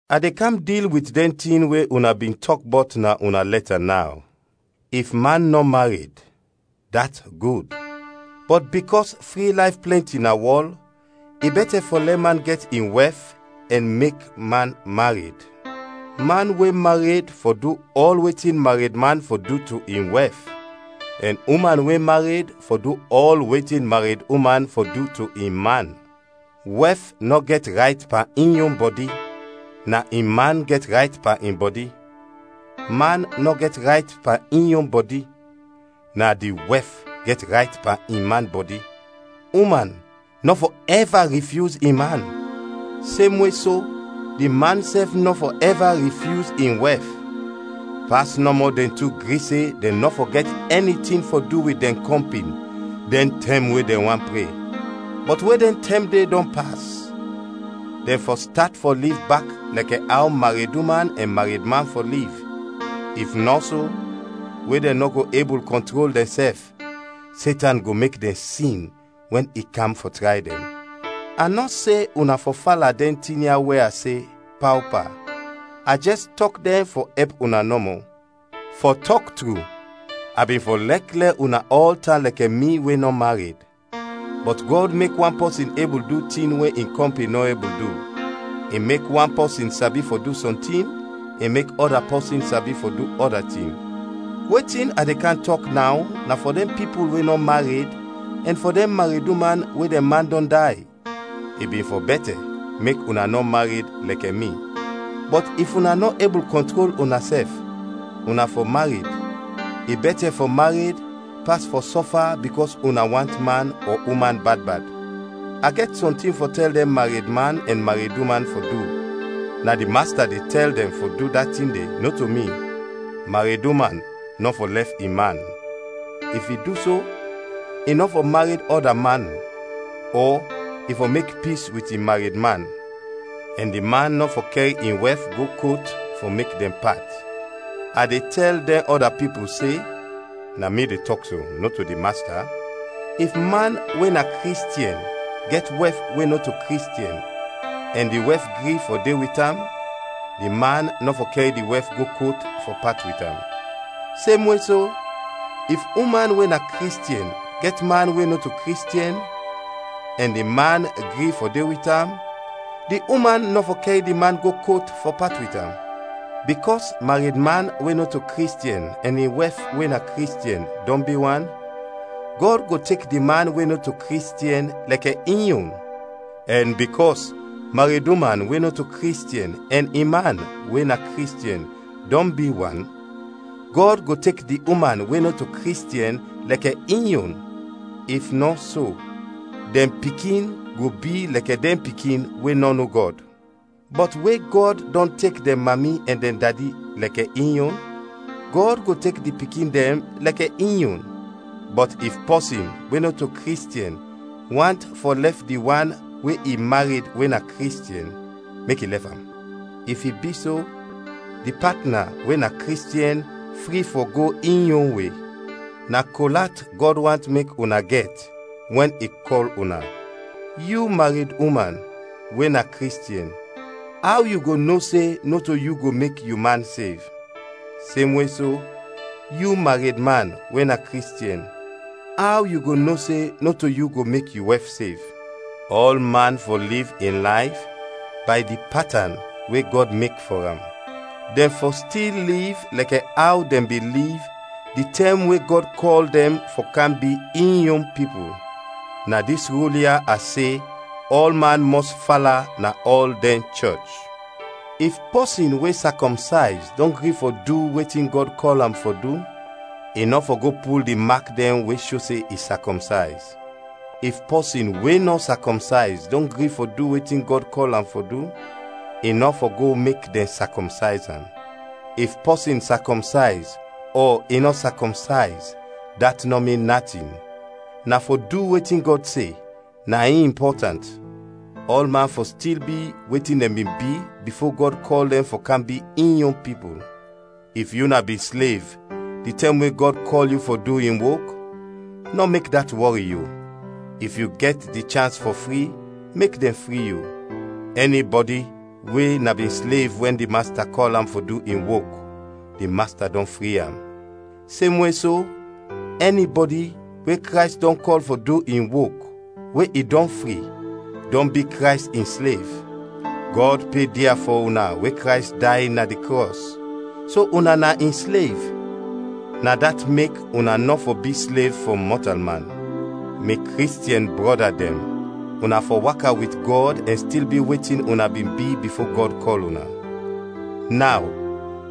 A de kam dil wit dɛn tin we una bin tɔk bɔt na una lɛta naw. If man nɔ mared, dat gud. Bɔt bikɔs fri layf plɛnti na wɔl, i bɛtɛ fɔ lɛ man gɛt in wɛf ɛn mek man mared. Man we mared fɔ du ɔl wetin maredman fɔ du to in wɛf, ɛn uman we mared fɔ du ɔl wetin mareduman fɔ du to in man. Wɛf nɔ gɛt rayt pan in yon bɔdi, na in man gɛt rayt pan in bɔdi; man nɔ gɛt rayt pan in yon bɔdi, na di wɛf gɛt rayt pan in man bɔdi. Uman nɔ fɔ ɛva rifyuz in man, semwe so di man sɛf nɔ fɔ ɛva rifyuz in wɛf, pas nɔmɔ dɛn tu gri se dɛn nɔ fɔ gɛt ɛni tin fɔ du wit dɛn kɔmpin dɛn tɛm we dɛn want pre; bɔt we dɛn tɛm de dɔn pas, dɛn fɔ stat fɔ liv bak lɛkɛ aw mareduman ɛn maredman fɔ liv, if nɔ so, we dɛn nɔ go ebul kɔntrol dɛnsɛf, Setan go mek dɛn sin wɛn i kam fɔ tray dɛn. A nɔ se una fɔ fala dɛn tin ya we a se, paopa, a jɛs tɔk dɛn fɔ ɛp una nɔmɔ. Fɔ tɔk tru, a bin fɔ lɛk lɛ una ɔl tan lɛkɛ mi we nɔ mared, bɔt Gɔd mek wan pɔsin ebul du tin we in kɔmpin nɔ ebul du. I mek wan pɔsin sabi fɔ du sɔntin, i mek ɔda pɔsin sabi fɔ du ɔda tin. Wetin a de kam tɔk naw na fɔ dɛn pipul we nɔ mared ɛn fɔ dɛn mareduman we dɛn man dɔn day. I bin fɔ bɛtɛ mek una nɔ mared, lɛkɛ mi. Bɔt if una nɔ ebul kɔntrol unasɛf, una fɔ mared: i bɛtɛ fɔ mared pas fɔ sɔfa bikɔs una want man ɔ uman bad bad. A gɛt sɔntin fɔ tɛl dɛn maredman ɛn mareduman fɔ du, na di Masta de tɛl dɛn fɔ du da tin de, nɔto mi: mareduman nɔ fɔ lɛf in man; if i du so, i nɔ fɔ mared ɔda man, ɔ i fɔ mek pis wit in maredman; ɛn di man nɔ fɔ kɛr in wɛf go kot fɔ mek dɛn pat. A de tɛl dɛn ɔda pipul se (na mi de tɔk so, nɔto di Masta:) if man we na Kristiɛn gɛt wɛf we nɔto Kristiɛn ɛn di wɛf gri fɔ de wit am, di man nɔ fɔ kɛr di wɛf go kot fɔ pat wit am. Semwe so, if uman we na Kristiɛn gɛt man we nɔto Kristiɛn ɛn di man gri fɔ de wit am, di uman nɔ fɔ kɛr di man go kot fɔ pat wit am. Bikɔs maredman we nɔto Kristiɛn ɛn in wɛf we na Kristiɛn, dɔn bi wan, Gɔd go tek di man we nɔto Kristiɛn lɛkɛ in yon. Ɛn bikɔs mareduman we nɔto Kristiɛn ɛn in man we na Kristiɛn, dɔn bi wan, Gɔd go tek di uman we nɔto Kristiɛn lɛkɛ in yon. If nɔ so, dɛn pikin go bi lɛkɛ dɛn pikin we nɔ no Gɔd. Bɔt we Gɔd dɔn tek dɛn mami ɛn dɛn dadi lɛkɛ in yon, Gɔd go tek di pikin dɛn lɛkɛ in yon. Bɔt if pɔsin we nɔto Kristiɛn want fɔ lɛf di wan we i mared we na Kristiɛn, mek i lɛf am. If i bi so, di patna we na Kristiɛn fri fɔ go in yon we. Na kol at Gɔd want mek una gɛt wɛn i kɔl una. Yu mareduman, we na Kristiɛn, aw yu go no se nɔto yu go mek yu man sev? Semwe so, yu maredman we na Kristiɛn, aw yu go no se nɔto yu go mek yu wɛf sev? Ɔlman fɔ liv in layf bay di patan we Gɔd mek fɔ am. Dɛn fɔ stil liv lɛkɛ aw dɛn bin liv di tɛm we Gɔd kɔl dɛn fɔ kam bi in yon pipul. Na dis rul ya a se ɔlman mɔs fala na ɔl dɛn chɔch. If pɔsin we sakɔmsayz dɔn gri fɔ du wetin Gɔd kɔl am fɔ du, i nɔ fɔ go pul di mak dɛn we sho se i sakɔmsayz; if pɔsin we nɔ sakɔmsayz dɔn gri fɔ du wetin Gɔd kɔl am fɔ du, i nɔ fɔ go mek dɛn sakɔmsayz am. If pɔsin sakɔmsayz ɔ i nɔ sakɔmsayz dat nɔ min natin; na fɔ du wetin Gɔd se, na in impɔtant. Ɔlman fɔ stil bi wetin dɛn bin bi bifo Gɔd kɔl dɛn fɔ kam bi in yon pipul. If yu na bin slev di tɛm we Gɔd kɔl yu fɔ du in wok, nɔ mek dat wɔri yu; if yu gɛt di chans fɔ fri, mek dɛn fri yu. Ɛnibɔdi we na bin slev wɛn di Masta kɔl am fɔ du in wok, di Masta dɔn fri am; semwe so, ɛnibɔdi we Krays dɔn kɔl fɔ du in wok, we i dɔn fri, dɔn bi Krays in slev. Gɔd pe dia fɔ una we Krays day na di krɔs, so una na in slev, na dat mek una nɔ fɔ bi slev fɔ mɔtalman. Mi Kristiɛn brɔda dɛn, una fɔ waka wit Gɔd ɛn stil bi wetin una bin bi bifo Gɔd kɔl una. Naw,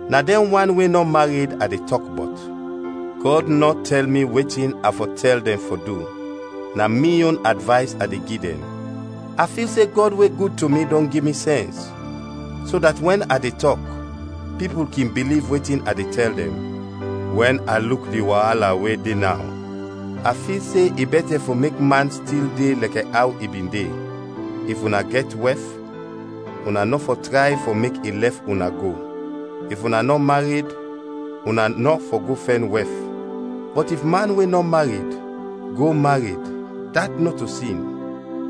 na dɛn wan we nɔ mared a de tɔk bɔt: Gɔd nɔ tɛl mi wetin a fɔ tɛl dɛn fɔ du, na mi yon advays a de gi dɛn. A fil se Gɔd we gud to mi dɔn gi mi sɛns, so dat wɛn a de tɔk, pipul kin biliv wetin a de tɛl dɛn. Wɛn a luk di waala we de naw, a fil se i bɛtɛ fɔ mek man stil de lɛkɛ aw i bin de. If una gɛt wɛf, una nɔ fɔ tray fɔ mek i lɛf una go. If una nɔ mared, una nɔ fɔ go fɛn wɛf. Bɔt if man we nɔ mared, go mared, dat nɔto sin;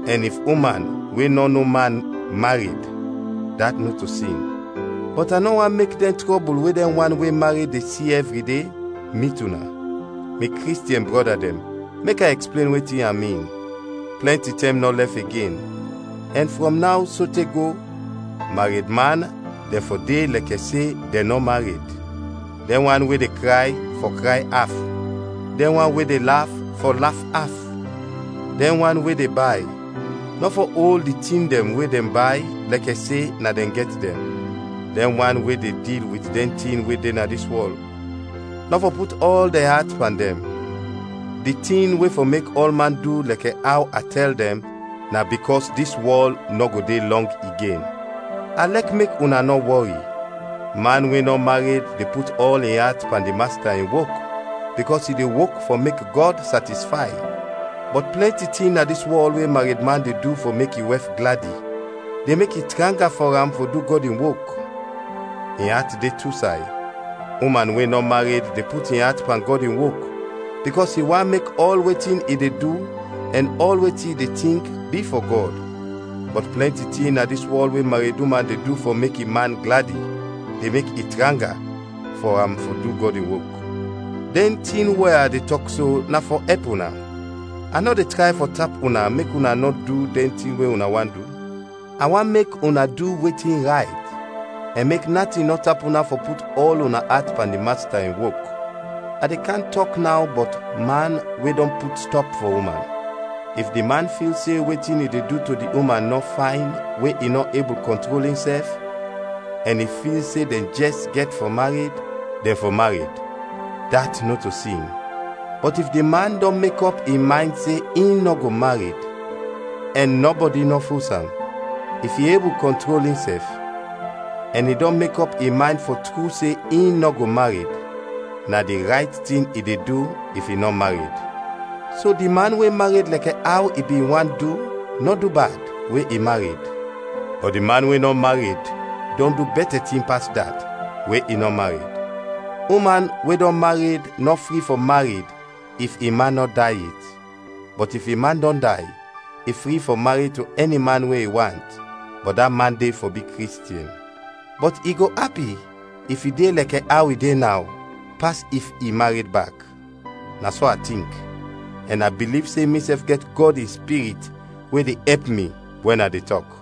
ɛn if uman we nɔ no man, mared, dat nɔto sin. Bɔt a nɔ want mek dɛn trɔbul we dɛn wan we mared de si ɛvri de, mit una. Mi Kristiɛn brɔda dɛn, mek a ɛksplen wetin a min: plɛnti tɛm nɔ lɛf igen, ɛn frɔm naw sote go, maredman dɛn fɔ de lɛkɛ se dɛn nɔ mared; dɛn wan we de kray, fɔ kray af; dɛn wan we de laf, fɔ laf af; dɛn wan we de bay, nɔ fɔ ol di tin dɛn we dɛn bay lɛkɛ se na dɛn gɛt dɛn; dɛn wan we de dil wit dɛn tin we de na dis wɔl, nɔ fɔ put ɔl dɛn at pan dɛn. Di tin we fɔ mek ɔlman du lɛkɛ aw a tɛl dɛn na bikɔs dis wɔl nɔ go de lɔng igen. A lɛk mek una nɔ wɔri. Man we nɔ mared de put ɔl in at pan di Masta in wok, bikɔs i de wok fɔ mek Gɔd satisfay. Bɔt plɛnti tin na dis wɔl we maredman de du fɔ mek in wɛf gladi, de mek i tranga fɔ am fɔ du Gɔd in wok; in at de tu say. Uman we nɔ mared de put in at pan Gɔd in wok, bikɔs i want mek ɔl wetin i de du ɛn ɔl wetin i de tink bi fɔ Gɔd; bɔt plɛnti tin na dis wɔl we mareduman de du fɔ mek in man gladi, de mek i tranga fɔ am fɔ du Gɔd in wok. Dɛn tin we a de tɔk so na fɔ ɛp una. A nɔ de tray fɔ tap una mek una nɔ du dɛn tin we una want du. A want mek una du wetin rayt, ɛn mek natin nɔ tap una fɔ put ɔl una at pan di Masta in wok. A de kam tɔk naw bɔt man we dɔn put stɔp fɔ uman. If di man fil se wetin i de du to di uman nɔ fayn we i nɔ ebul kɔntrol insɛf, ɛn i fil se dɛn jɛs gɛt fɔ mared, dɛn fɔ mared. Dat nɔto sin. Bɔt if di man dɔn mekɔp in maynd se in nɔ go mared, ɛn nɔbɔdi nɔ fos am; if i ebul kɔntrol insɛf; ɛn i dɔn mekɔp in maynd fɔ tru se in nɔ go mared; na di rayt tin i de du if i nɔ mared. So di man we mared lɛkɛ aw i bin want du nɔ du bad, we i mared; bɔt di wan we nɔ mared dɔn du bɛtɛ tin pas dat, we i nɔ mared. Uman we dɔn mared nɔ fri fɔ mared if in man nɔ day yet, bɔt if in man dɔn day, i fri fɔ mared to ɛni man we i want, bɔt da man de fɔ bi Kristiɛn. Bɔt i go api if i de lɛkɛ aw i de naw, pas if i mared bak. Na so a tink, ɛn a biliv se misɛf gɛt Gɔd in Spirit we de ɛp mi wɛn a de tɔk.